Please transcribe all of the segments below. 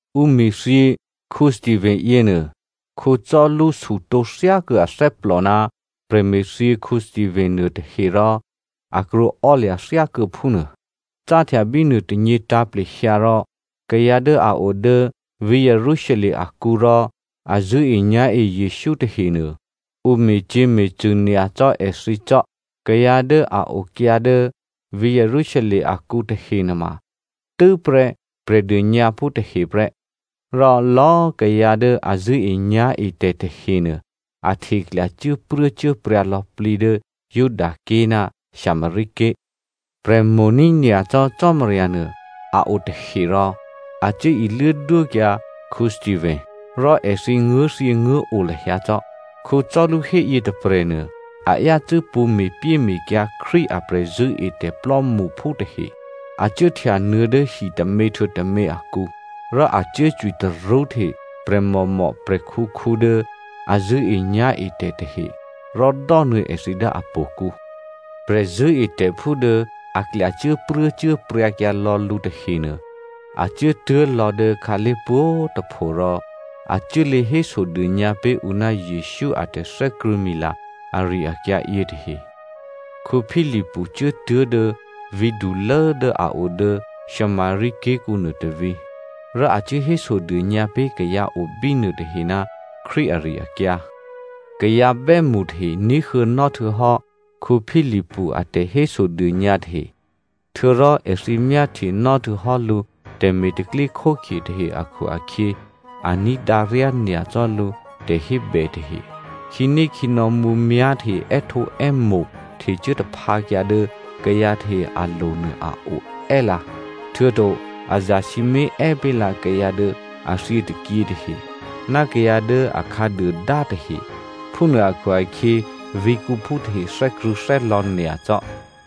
Ǔ me̤thyě Stephano yěnuô, Saulu sutǒ thyákuô̌ athè́plò ná prè̤me̤thyě Stephano nuôtahe rò a krwǒò́lya̤ thyákuô̌ phúnuô. Cáhtya bínuô tônyě tǎ̤plehyǎ rò kayǎ dố a o dố vǐ̤ Jerusalem akǔ rò a zṳ̂́enyá̤e Jesǔ tahenuô ǔ me̤cyě̤me̤cṳ̂ nyacò́ èthǐ cò́. Kayǎ dố a okyǎ dố vǐ̤ Jerusalem akǔ tahe nuôma tû́prè́ Prè̤dônyǎphú tahe prè́. Rò lò̌꤮ kayǎ dố a zṳ̂́enyá̤etè̤ tahenuô a hteklya cuốpruốcuốpryǎ lò̌plǐ dố Judaké̤ ná Samaria ké̤. Prè̤ mo̤ní̤ nyacò́ Cò́marya nuô a o tahe rò a cuố iluố dwókyǎ Stephano. Rò èthǐ nguố̤thyěnguố̤o lahyǎ cò́. Saulu héyě tôprè̤nuô a yácû́ pṳ̌ me̤pyéme̤kyǎ Krístu a prè̤zṳ̂́etè̤ plò́mṳphú tahe. A cuốhtya nuô̌ dố hitômě htuô̌ tômě akǔ, rò a cuốcwi tarṳ́hte prè̤mòmò, prè̤khǔkhǔ dố a zṳ̂́enyá̤etè̤ tahe rò dò́nuô̌ èthǐ dố htò̌kǔ. Prè̤zṳ̂́etè̤phú dố a klyacuốpruốcuốpryǎ kyǎ lò̌ lǔ tahenuô, a cuốtuố̤lò̌ dố khǎlé̤ pwǒ̤꤮ tôpho rò a cuốlě hésodônyǎ pé̤ ǔ ná Jesǔ a tè̤thè́krṳ̂̌mila ari-akyǎ yětahe. Philipu cuốtuố̤ dố vǐ̤dulố dố a o dố Samaria ké̤kǔnuô tôvǐ̤. Rò a cuố hésodônyǎ pé̤ kayǎ o bínuô tahe ná Krístu ari-akyǎ. Kayǎ bè́mṳ tahe ní̤huô̌nò́ htuô̌hò́ Philipu a tè̤hésodônyǎ tahe, htuô̌rò èthǐ myáhtyenò́ htuô̌hò́ lǔ tè̤me̤ tè̤pro̤tè̤prya̤ tahe akhu-akhyě a ní̤dǎ ryányacò́ lǔ tè̤hébè tahe. Khǐnékhǐnò̌ mǔmyá̤ tahe è́htǒè́mo̤ htecuố taphǎkyǎ dố kayǎ tahe alo̤ nuô a o è́lǎ, htuô̌to a zasǐmé̤ è́ pé̤ lǎ kayǎ dố a thyětôkyě tahe ná kayǎ dố a khǎduôdá tahe. Phúnuô akhu-akhyě, vǐ̤kǔphú tahe thè́krṳ̂̌thè́lò̌ nyacò́.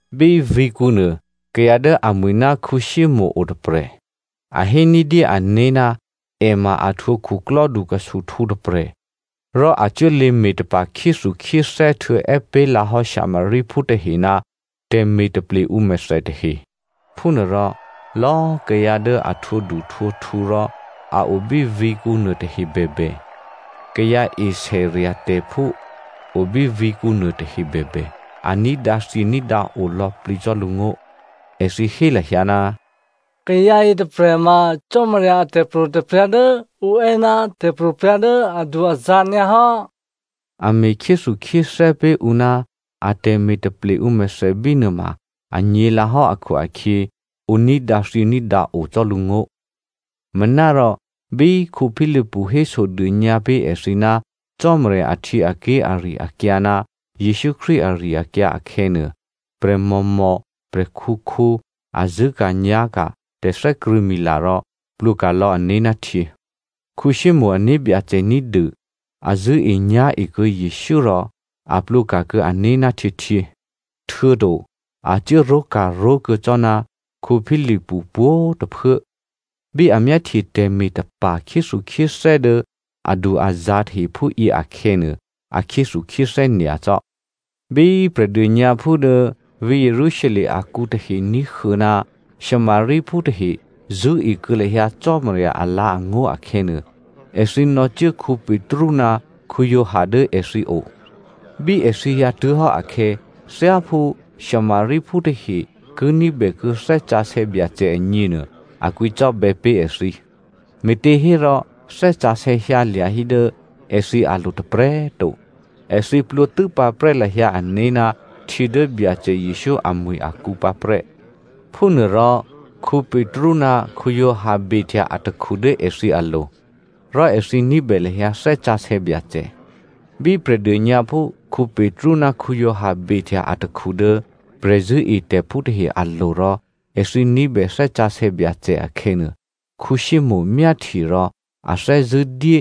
Bí vǐ̤kǔnuô kayǎ dố amwi̤ ná Simonè o tôprè̤. A hé ní̤dyé ané̤ ná è ma a htwǒ khuklò́du khusuhtǔ tôprè̤, rò a cuốlě me̤tapa̤ khyéthukhyéthè́ htuô̌ è́ pé̤ lǎ hò́ Samariaphú tahe ná tè̤me̤ taple ǔmèthè tahe. Phúnuôrò lò̌꤮ kayǎ dố a htwǒduhtwǒkhu rò a o bí vǐ̤kǔ nuôtahe bèbè, kayǎ esè rya̤tè̤phú o bí vǐ̤kǔ nuôtahe bèbè, a ní̤dǎthyění̤dǎo lò̌plǐ cò́ lǔngó̤. Èthǐ hé lahyǎ, “Kayǎ yětôprè̤ ma Cò́marya a tè̤pro̤tè̤prya̤ dố ǔ è́ ná tè̤pro̤prya̤ dố adu-azǎ̤ nyǎhò́.” A me̤ khyéthukhyéthè́ pé̤ ǔ ná atè̤me̤ taple ǔmèthè bínuô ma anyě̤lǎhò́ akhu-akhyě, ǔ ní̤dǎthyění̤dǎo cò́ lǔngó̤. Manárò bí Philipu hésodônyǎ pé̤ èthǐ ná Cò́marya ahtyěaké̤ ari-akyǎ ná Jesǔ Krístu ari-akyǎ akhè̌nuô, prè̤mòmò, prè̤khǔkhǔ a zṳ̂́ka̤nyá̤ka̤ tè̤thè́krṳ̂̌mila rò plwǒka̤ lò̌ ané̤ ná htyě. Simonè ané̤byacè ní̤dû a zṳ̂́enyá̤e kuô̌ Jesǔ rò a plwǒka̤kuô̌ ané̤ ná htyěhtyě, htuô̌to a cuốró̤ka̤ró̤ kuô̌ cò́ ná Philipu pwǒ̤꤮ tôphuố. Bí a myáhtye tè̤me̤tapa̤ khyéthukhyéthè́ dố adu-azǎ̤ tahe phúyě akhè̌nuô, a khyéthukhyéthè́ nyacò́. Bí Prè̤dônyǎphú dố vǐ̤ Jerusalem akǔ tahe ní̤huô̌ ná Samariaphú tahe zṳ̂́e kuô̌ lahyǎ Cò́marya alǎ̤angó̤ akhè̌nuô, èthǐ nò̌cuố Petru ná Giovanni dố èthǐo. Bí èthǐ hyǎtuố̤hò́ akhè̌, thyáphú Samariaphú tahe ki ní̤bèkuô̌ Thè́ Sǎsè̌ Byacè agněnuô, a kwǐcò́bè̌ pé̤ èthǐ. Me̤těhérò Thè́ Sǎsè̌ hyǎlya̤ hí dố èthǐ alo̤ tôprè̤꤮ to. Èthǐ plwǒ tû́pǎprè́ lahyǎ ané̤ ná htyě dố Byacè Jesǔ amwi̤ akǔ pǎprè́. Phúnuôrò Petru ná Giovanni behtya atakhu dố èthǐ alo̤, rò èthǐ ní̤bè lahyǎ Thè́ Sǎsè̌ Byacè. Bí Prè̤dônyǎphú Petru ná Giovanni behtya atakhu dố prè̤zṳ̂́etè̤phú tahe alo̤ rò èthǐ ní̤bè Thè́ Sǎsè̌ Byacè akhè̌nuô, Simonè myáhtye rò a thè́zṳ̂́ dyé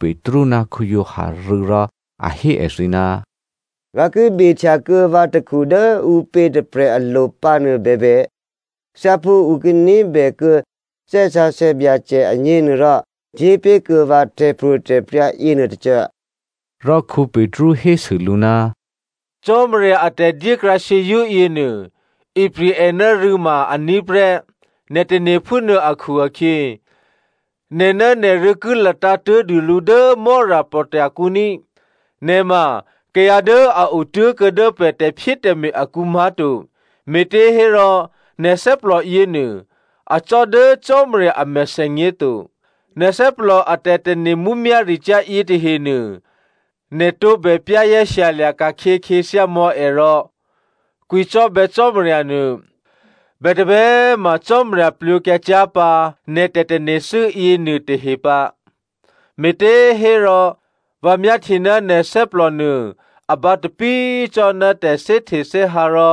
Petru ná Giovanni rû̌ rò a hé èthǐ, “Vǎ ki behtya kuô̌ vǎ takhu dố ǔpě tôprè̤ alo̤ pǎ nuô bèbè, thyáphú ǔ ki ní̤bèkuô̌ Thè́ Sǎsè̌ Byacè agněnuôrò, dyépé̤kuô̌ vǎ tè̤pro̤tè̤prya̤ yěnuôtôcô.” Rò Petru hésû lǔ, “Cò́marya a tè̤dyékrǎ shyězṳ́ yěnuô, ipri̤ è ná rû̌ ma aní̤ prè́, nè̤ tane̤ phúnuô akhu-akhyě, nè̤ ná nè̤rû̌ ki latǎ̤ tố̤dûlǔ dố Mò́rapò̤tya̤ kǔ ní꤮. Nè̤ ma kayǎ dố a otố̤kuô̌ dố pè̤ tè̤phyétè̤me̤ akǔ má̤to, me̤těhérò nè̤ thè́plò yěnuô, acò́ dố Cò́marya a mèthènyě to. Nè̤ thè́plò a tè̤tane̤ mǔmyá̤ricyá̤ yětahenuô, nè̤ tǒbè za̤ ní̤dû mò̌ è rò kwǐcò́bè̌ Cò́marya nuô. Bètǒbè꤮ ma Cò́marya plwǒkyǎ cyá̤ pǎ nè̤ tè̤tane̤thû́ yěnuô tahe pǎ. Me̤těhérò vǎ myáhtye ná nè̤ thè́plò nuô a bǎtapí cò́ ná tè̤thè́htethè́hǎ rò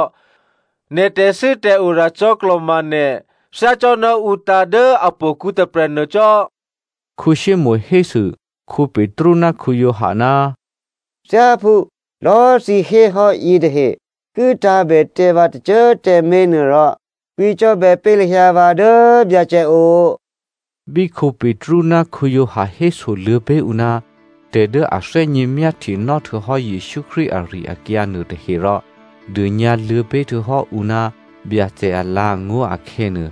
nè̤ tè̤thû́tè̤ora cò̌klò̤ma nè̤ thyácò́ná ǔ tǎ̤ dố htò̌kǔ tôprè̤nuô cò́.” Simonè hésû Petru ná Giovanni, “Thyáphú lò̌꤮ thǐ héhò́ yětahe ki tǎ̤bè tǎ vǎ tôcô꤮ tǎmé̤ nuô rò kwǐcò́bè̌ pé̤ lahyǎ vǎ dố Byacè o.” Bí Petru ná Giovanni hésoluô̌ pé̤ ǔ ná tè̤ dố a thè́gně myáhtyenò́ htuô̌hò́ Jesǔ Krístu ari-akyǎ nuôtahe rò dônyǎluô̌ pé̤ htuô̌ ǔ ná Byacè alǎ̤angó̤ akhè̌nuô,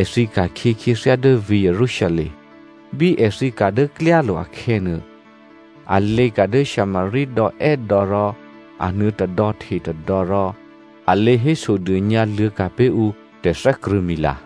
èthǐ ka̤khyě khyěthyá dố vǐ̤ Jerusalem. Bí èthǐ ka̤ dố klyálo̤ akhè̌nuô, a lěka̤ dố Samaria dò̌ è́dò̌ rò a nuô̌ tôdò̌ hte tôdò̌ rò a lě hésodônyǎ luô̌ ka̤ pé̤ ǔ tè̤thè́krṳ̂̌mila.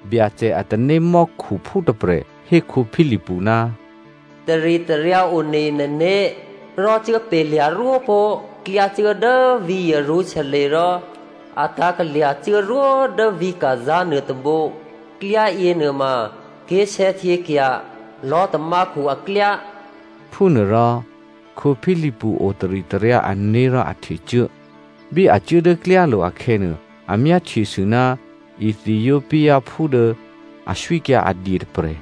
Byacè a tanémò́khuphú tôprè̤ hé Philipu, “Taritaryǎ one nè̤né̤ rò cuốpalya̤ rwópó̤ klyá cuố dố vǐ̤ Jerusalem rò a tǎ̤kalya̤ cuốrwó dố vǐ̤ Gaza nuôtôbǒ. Klyá yěnuôma ké̤sè̌htyěkya̤ lò̤́tamákhu aklyá.” Phúnuôrò Philipu o taritaryǎ ané̤ rò a htecuố. Bí a cuố dố klyálo̤ akhè̌nuô, a myáhtyesû ná Ethiopiaphú dố aswíkyǎ a dye tôprè̤.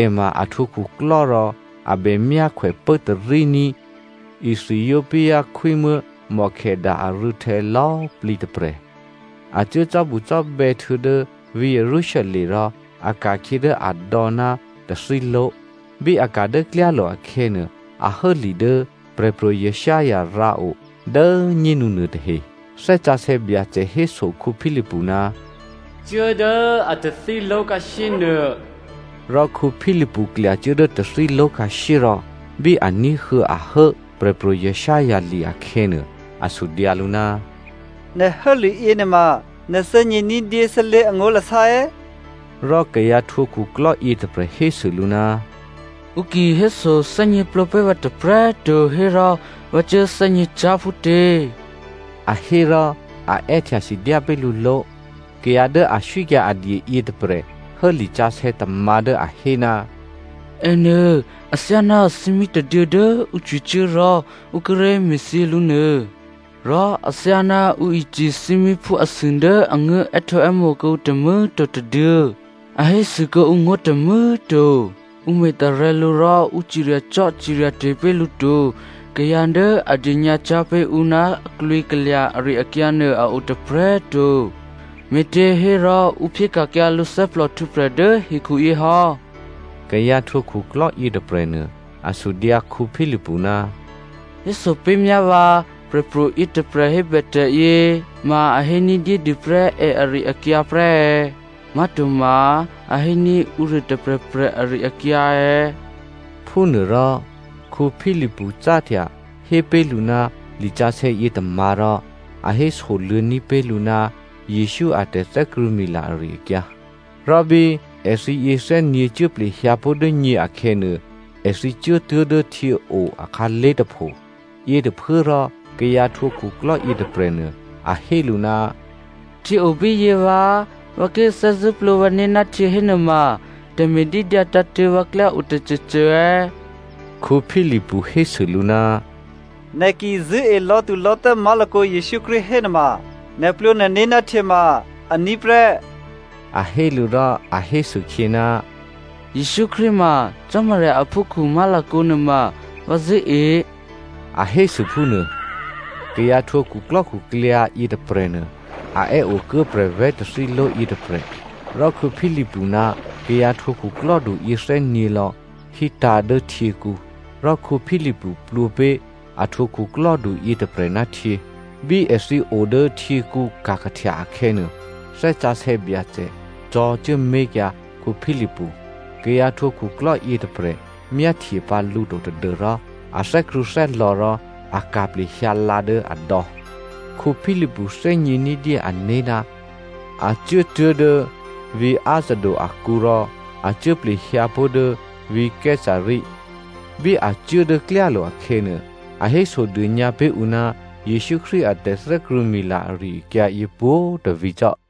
È ma a htwǒ khuklò́ rò a bè myákhwè pốtaríní̤ Ethiopia khwímuố̤ Candace arû̌htè̌ lò̌꤮ plǐ tôprè̤. A cuố cò́bucò́bè̌ htuô̌ dố vǐ̤ Jerusalem rò a ka̤khyě dố adò̌ ná tathíló̤. Bí a ka̤ dố klyálo̤ akhè̌nuô, a hố li dố Prè̤pro̤ Isaiah rǎo dố꤮ nyénu nuôtahe. Thè́ Sǎsè̌ Byacè héso Philipu, “Cuố dố a tathíló̤ khǎshyénuô.” Rò Philipu klyacuố dố tathíló̤ khǎshyé rò bí a ní̤huô̌ a hố Prè̤pro̤ Isaiah li akhè̌nuô, a sudyǎ lǔ, “Nè̤ hố liyě nuôma, nè̤ thè́gně ní̤dyé sálé̤ angó̤lasá è̌?” Rò kayǎ htwǒ khuklò́ yětôprè̤ hésû lǔ, “Ǔ ki hésothè́gněplǒ pé̤ vǎ tôprè̤꤮ to hérò vǎ cuố thè́gněcyá̤ phútě?” A hé rò a è́htya sidyá pé̤ lǔ ló̤. Kayǎ dố aswíkyǎ adye yětôprè̤ hố lisǎsè̌ tômǎ̤ dố a hé, “Ènuô athyáná thímí tôduô̌ dố ǔ cwicuố rò ǔ kíré̤ me̤thyě lǔ nuô, rò athyáná ǔ icǐ thímíphú asû dố a nguố̤ è́htǒè́mo̤ kuô̌ǔ tômû̌꤮ to tôduô̌, a hésû kuô̌ǔ ngó̤ tômû̌꤮ to. Ǔ me̤tarè̤̌ lǔ rò ǔ ciryacò́ciryate̤ pé̤ lǔ to, kayǎ dố a dônyǎcyá̤ pé̤ ǔ ná a klwǐkalya̤ ari-akyǎ nuô a o tôprè̤꤮ to, me̤těhérò ǔ phyéka̤kyǎ lǔ thè́plòhtwǒprè̤ dố hekhuyě hò́.” Kayǎ htwǒ khuklò́ yětôprè̤nuô, a sudyǎ Philipu, “Héso pé̤myá vǎ prè̤pro̤ yětôprè̤ hébè tè̤yě, ma a hé ní̤dyédû prè́ è ari-akyǎ prè́ è̌? Má̤toma a héní̤ ǔruô tôprè̤prè̤ ari-akyǎ è̌?” Phúnuôrò Philipu cáhtya hé pé̤ lǔ ná lisǎsè̌ yětômǎ̤ rò a hésoluô̌ní̤ pé̤ lǔ ná Jesǔ a tè̤thè́krṳ̂̌mila ari-akyǎ. Rò bí èthǐ yěthè́nyě̤ cuố plehyǎ pó̤ dố nyě akhè̌nuô, èthǐ cuốtuố̤ dố htyěo akhǎlé̤ tôpho. Yětôphuốrò kayǎ htwǒ khuklò́ yětôprè̤nuô a hé lǔ, “Htyě o bíyě vǎ꤮! Vǎ ki thè́zṳ̂́ plwǒ vǎné̤ ná htyě hénuôma tè̤me̤dídyǎ tǎ̤tṳ̂̌ vǎklyá o tôcôcô è̌?” (Philipu hésû lǔ, “Nè̤ ki zṳ̂́e lò̌thulò̌thè́ má̤lakǒ Jesǔ Krístu hénuôma, nè̤ plwǒ nè̤né̤ ná htyě ma aní̤ prè́.” A hé lǔ rò a hésûkhyě, “Jesǔ Krístu ma Cò́marya aphúkhǔ má̤lakǒ nuôma vǎ zṳ̂́e” a hésû phúnuô) kayǎ htwǒ khuklò́khuklyǎ yětôprè̤nuô a è́ okuố prè̤vè̤́ tathíló̤ yětôprè̤. Rò Philipu ná kayǎ htwǒ khuklò́du yěthè́nyě̤ lò̌ hítǎ̤ dố htyěkǔ, rò Philipu plwǒ pé̤ a htwǒ khuklò́du yětôprè̤ ná htyě. Bí èthǐ o dố htyěkǔ ka̤kahtya akhè̌nuô, Thè́ Sǎsè̌ Byacè cò̤̌cuố mé̤kyǎ Philipu. Kayǎ htwǒ khuklò́ yětôprè̤ myáhtye pǎ lǔ to tadû́rò a thè́krṳ̂̌thè́lò̌ rò a ka̤ plehyǎ lǎ dố adò̌. Philipu thè́gně ní̤dyé ané̤ ná a cuốtuố̤ dố vǐ̤ Azoto akǔ rò a cuố plehyǎpó̤ dố vǐ̤ Caesarea. Bí a cuố dố klyálo̤ akhè̌nuô, a hésodônyǎ pé̤ ǔ ná Jesǔ Krístu a tè̤thè́krṳ̂̌mila ari-akyǎ yě pwǒ̤꤮ tôvǐ̤ cò́.